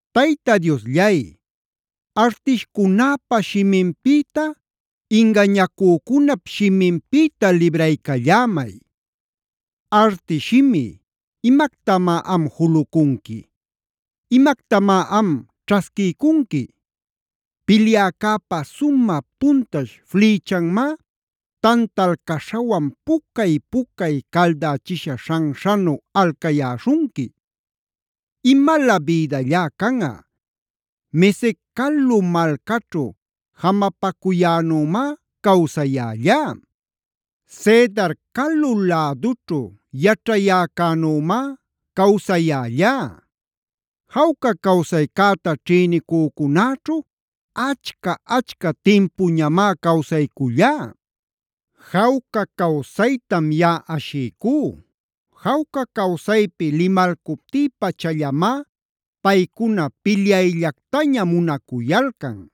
Tayta Diosllay, artishcunäpa shiminpïta, ingañacücunap shiminpïta libraycallämay. Artish shimi, ¿imactamá am julucunqui? ¿Imactamá am ćhasquiycunqui? Pilyäcäpa sumä puntash flïchanmá tantal caśhawan pucay-pucay caldächisha śhanśhanu alcayäśhunqui. ¡Imalä bïdallá canꞌa! Mesec calu malcaćhu jamapacuyänümá cawsayällá. Cedar calu lädućhu yaćhayäcänümá cawsayällá. Jawca cawsaycäta ćhïnicücunäćhu achca-achca timpuñamá cawsaycullá. Jawca cawsaytam yaꞌa ashiycú. Jawca cawsaypi limalcuptï-pachallamá paycuna pilyayllactaña munacuyalcan.